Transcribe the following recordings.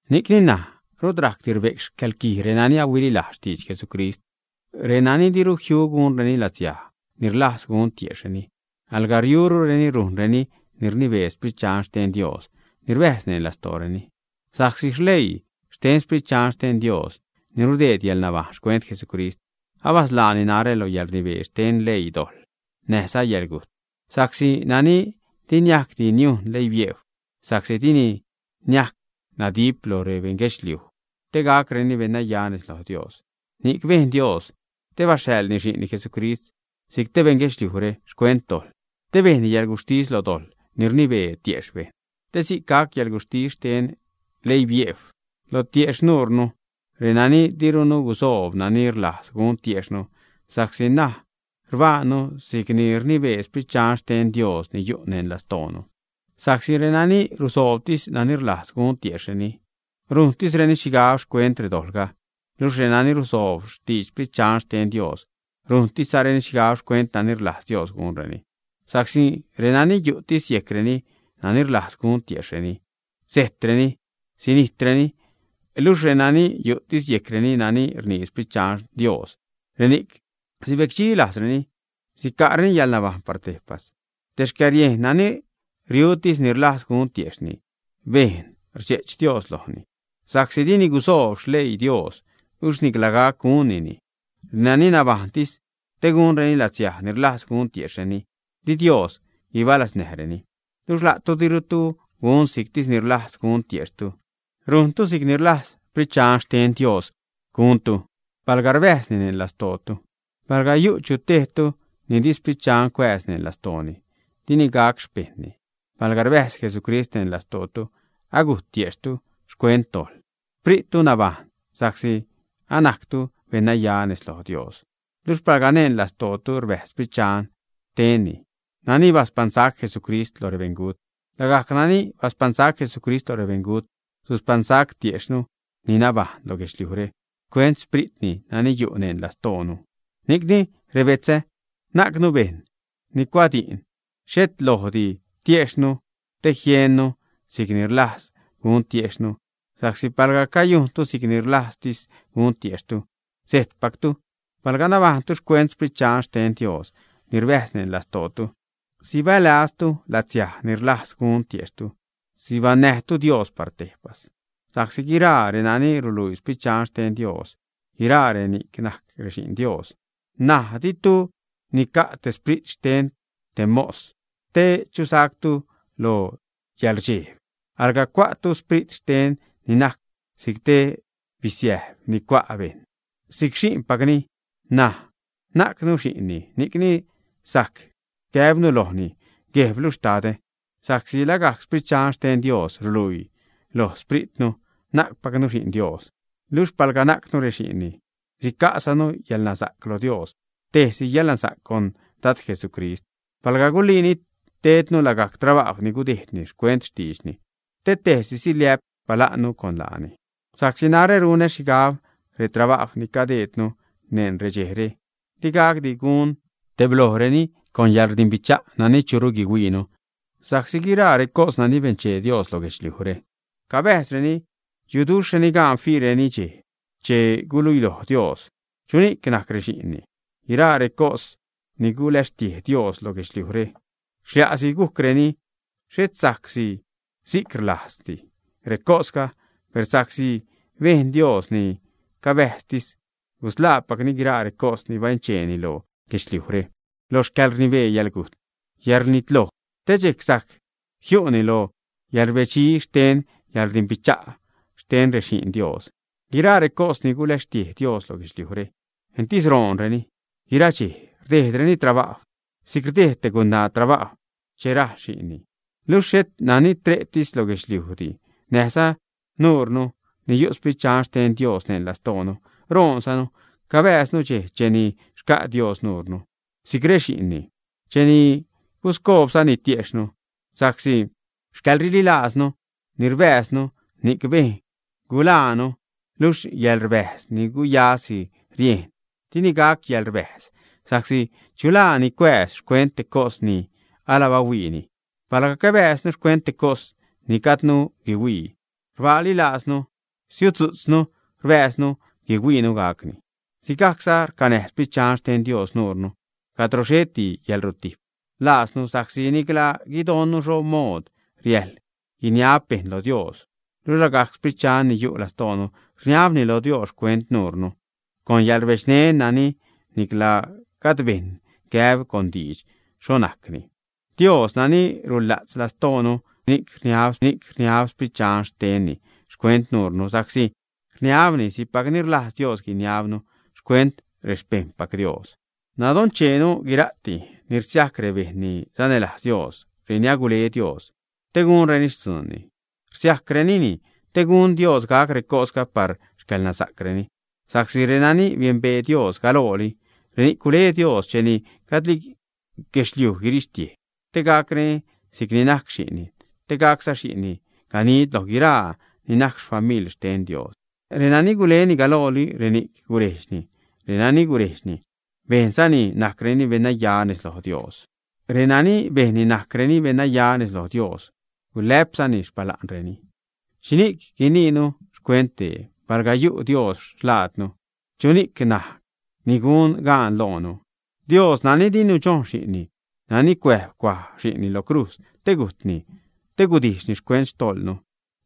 Ni'cni ṉaj rut rajcdi rbe'c xcäḻquij renani ahuililajz xtidx Jesucrist, renani diru jiu gunreni latsiaj ni rlajz gun tiejxhreni, alga riurureni rujnreni ni rnibee Sprit Dxan xten Dios ni rbäjz neṉ lastooreni. Sa'csi leii xten Sprit Dxan xten Dios ni rudeed yäḻnabajṉ xcuent Jesucrist, abasḻaani narä lo yäḻrnibee xten xleii dojḻ näjza yäḻgujt. Sa'csi nani di niajcdi niujn leibiejw, sa'csi dini niajc nadip lo rebeṉguedxliuj te gacreni beṉnaya nez loj Dios, ni'c bejn Dios che baxhaḻni Xi'nni Jesucrist, si'c te beṉ guedxliujre xcuent dojḻ, te bejnni yäḻguxhtis lo dojḻ ni rnibee tiejxh bejṉ. Te si'c gac xcäḻguxhtis xten leibiejw lo tiejxh nuurnu, renani dirunu gusoob nani rlajz gun tiejxhnu, sa'csi ṉaj rbajṉnu si'c ni rnibee Sprit Dxan xten Dios ni yu' neṉ lastoonu. Sa'csi renani rusoobtis nani rlajz gun tiejxhreni, rujntisreni xhigab xcuent redojḻga, luxh renani rusoob xtidx Sprit Dxan xten Dios rujntisreni xhigab xcuent nani rlajz Dios gunreni. Sa'csi renani yu'tis yejcreni nani rlajz gun tiejxhreni, sejtreni, sinijtreni; luxh renani yu'tis yejcreni nani rnii Sprit Dxan Dios, reni'c sibecdxi lajzreni, sica'reni yäḻnabajṉ lo Dios par tejpas. Te xcäriejn nani riutis ni rlajz gun tiejxh bejṉ rdxe'ch Dios lojni sa'csi dini gusoob xleii Dios, luxh nicla gac gunnini. Renani nabajṉtis te gunreni latsiaj ni rlajz gun tiejxhreni di Dios guibalaznäjreni. Luxh la'tu dirutu gun si'ctis ni rlajz gun tiejxhtu, ni'cni rujntu si'c ni rlajz Sprit Dxan xten Dios guntu, palga rbäjzni neṉ lastootu. Palga yu' chu tejtu ni di Sprit Dxan cuääz neṉ lastooni, di ni'c gac xpejṉni. Palga rbäjz Jesucrist neṉ lastootu, agujt tiejxhtu xcuent dojḻ, xprittu nabajṉ sa'csi anajctu beṉnaya nez loj Dios. Luxh palga neṉ lastootu rbäjz Sprit xten nani baspaṉsac Jesucrist loj rebeṉgut, lagajc nani baspaṉsac Jesucrist lo rebeṉgut suspaṉsac tiexhnu ni nabajṉ lo guedxliujre xcuent Xpritni nani yu' neṉ lastoonu. Ni'cni rebetzä, najcnu bejṉ ni cuaj di'n, xhet lojdi tiexhnu te jiennu si'c ni rlajz gun tiexhnu. Sa'csi palga cayujntu si'c ni rlajztis gun tiejxhtu, sejtpactu. Palga nabajṉtu xcuent Sprit Dxan xten Dios ni rbäjz neṉ lastootu, sibälaztu latsiaj ni rlajz gun tiejxhtu, sibaṉnäjtu Dios par tejpas. Sa'csi guiraa renani ruluii Sprit Dxan xten Dios guiraa reni'c najc rexi'n Dios. N̲aj ditu nica' te sprit xten te mos te chusactu lo yäḻrdxejb, alga cua'tu sprit xten ni najc si'c te bisiäjb ni cua' bejṉ si'c xi'npacni, ṉaj najcnu xi'nni, ni'cni sajc gäbnu lojni: “Guejblu, Xtadä.” Sa'csi lagajc Sprit Dxan xten Dios ruluii loj xpritnu, najcpacnu xi'n Dios. Luxh palga najcnu rexi'nni, sica'zanu yäḻnasa'c lo Dios, tejsi yäḻnasa'c con Dad Jesucrist, palga guliini tednu lagajc trabajw ni gudejdni xcuent xtiidxni, te tejsiza siliä'p xpala'nnu con laani. Sa'csi narä runä xhigab retrabajw ni cadejdnu neṉ redxejre, digacdi gun tebloonureni con yäḻrdimbicha' nani churu guihuiinu. Sa'csi guiraa recos nani benchee Dios lo guedxliujre, cabäjzreni, yuduxhreni gaan fiireni dxej che guluiloj Dios chuni'c najc rexi'nni. Guiraa recos ni gulecxtiej Dios lo guedxliujre, xlia'si gujcreni, xhet sa'csi si'c rlajzdi recosga, per sa'csi si'c bejn Dios, ni cabäjztis gusḻaapacni guiraa recos ni bencheeni lo guedxliujre lo xcäḻrnibee yäḻgujt, yäḻrnitloj, te dxejc sajc jiu'ni lo yäḻrbedxi xten xcäḻrdimbicha' xten rexi'n Dios. Guiraa recos ni gulecxtiej Dios lo guedxliujre entis roonreni, guira dxej rdejdreni trabajw, si'c rdejd te gunaa trabajw che rajl xi'nni. Luxh xhet nani tre'tis lo guedxliujdi, näjza nuunu ni yu' Sprit Dxan xten Dios neṉ lastoonu, roonzanu cabääznu dxej cheni xca' Dios nuure si'c rexi'nni, cheni guscoobzani tiexhnu. Sa'csi xcäḻrililaaznu ni rbääznu, ni'c bejn guḻaanu luxh yäḻrbäjz ni guyasi rieṉ, di ni'c gac yäḻrbäjz, sa'csi ¿chu laa ni cuääz xcuent te cos ni ala bahuiini? Palga cabääznu xcuent te cos ni gajdnu guihuii, rbaali laaznu, rsiudzu'tznu rbäjznu guihuiinu gacni. Sigajcza racnäj Sprit Dxan xten Dios nuure cadro xheti yäḻrutijp laaznu sa'csi nicla guidonnu xho mood riäjḻ guiniab bejṉ lo Dios. Luxh lagajc Sprit Dxan ni yu' lastoonu rniabni lo Dios xcuent nuure con yäḻrbedxneṉ nani nicla gajd bejṉ gäb con diidx xho najcni. Dios, nani rula'tz lastoonu, nanchee xhini'c rniab Sprit Dxan xtenni xcuent nuurnu, sa'csi rniabni si'cpac ni rlajz Dios guiniabnu xcuent rexpejṉpac Dios. Nadoncheenu guira'ti ni rsiajc rebejṉ ni sanälajz Dios, reni agule Dios te gunreni xtzuunni rsiajcrenini te gun Dios gac recosga par xcäḻnasa'creni. Sa'csi renani biembee Dios galooli, reni'c gule Dios cheni gajdli guirixtiej guedxliujre, te gacreni si'c ni najc Xi'nni; te gacza Xi'nni ganid loj guiraa ni najc famil xten Dios. Renani guleni galooli, reni'c gurejdxni; renani gurejdxni, bejnzani najcreni beṉnaya nez loj Dios; renani bejnni najcreni beṉnaya nez loj Dios, gulä'pzani xpala'nreni. ¿Xhixhni'c guiniinu xcuent dee? Palga yu' Dios xlaadnu, ¿chuxh ni'c najc ni gun gaan loonu? Dios nani di nudxojn Xi'nni, nani cuäjb cuaj Xi'nni lo crujz te gujtni, te gudijxni xcuent xtojḻnu,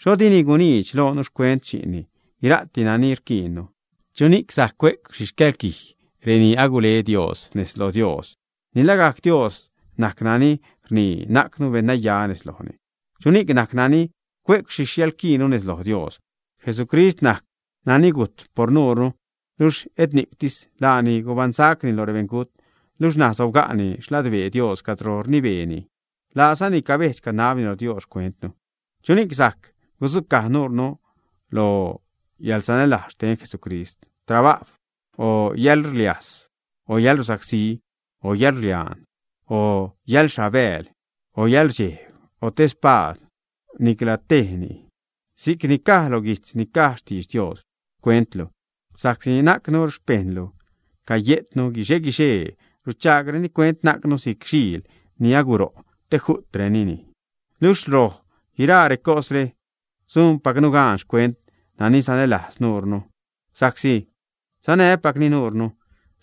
¿xho dini guniidx loonu xcuent Xi'nni guira'ti nani rquiinnu, ä? ¿Chuni'c sajc cue'c xhi xcäḻquij reni agule Dios nez lo Dios, ä? Ni lagajc Dios najc nani rnii najcnu beṉnaya nez lojni. ¿Chuni'c najc nani cue'c xhi xcäḻquijnu nez lo Dios? Jesucrist najc nani gujt por nuure, luxh et ni'ctis. Laani gubaṉsaczani loj rebeṉgujt, luxh ṉaj sobga'ni xladbee Dios cadro rnibeeni; laazani cabejdx canabni lo Dios xcuentnu. ¿Chuni'c sajc gudzucaj nuurnu lo yäḻsanälajz xten Jesucrist: trabajw, o yäḻxliajs, o yäḻrusacsí, o yäḻrliaan, o yäḻxhabääl, o yäḻrdxejb, o te spaad, ä? Nicla tejni. Si'c ni caj lo guijtz ni caj xtidx Dios: Xcuentlu, sa'csi najcnu xpejṉlu caye'tnu guixe-guixee. Ruchaagreni cuent najcnu si'c xiil ni aguro' te ju't bejṉni. Luxh loj guiraa recosre, sujnpacnu gaan xcuent nani sanälajz nuure, sa'csi sacnäjpacni nuure.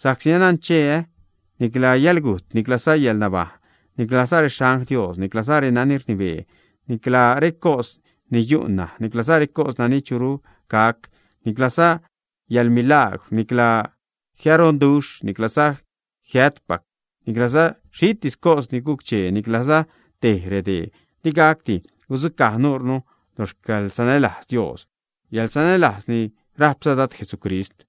Sa'csi anancheä nicla yäḻgujt, niclza yäḻnabajṉ, nicla rexangl Dios, niclaza renani rnibee, nicla recos ni yu' ṉaj, niclaza recos nani churu gac, niclaza yäḻmilaagwr, nicla jiaroduxh, niclaza jiäjtpac, niclaza xhitis cos ni guc-chee, nicla tej redee di gacdi gudzucaj nuurnu lo xcäḻsanälajz Dios, yäḻsanälajz ni rajpza Dad, Jesucrist.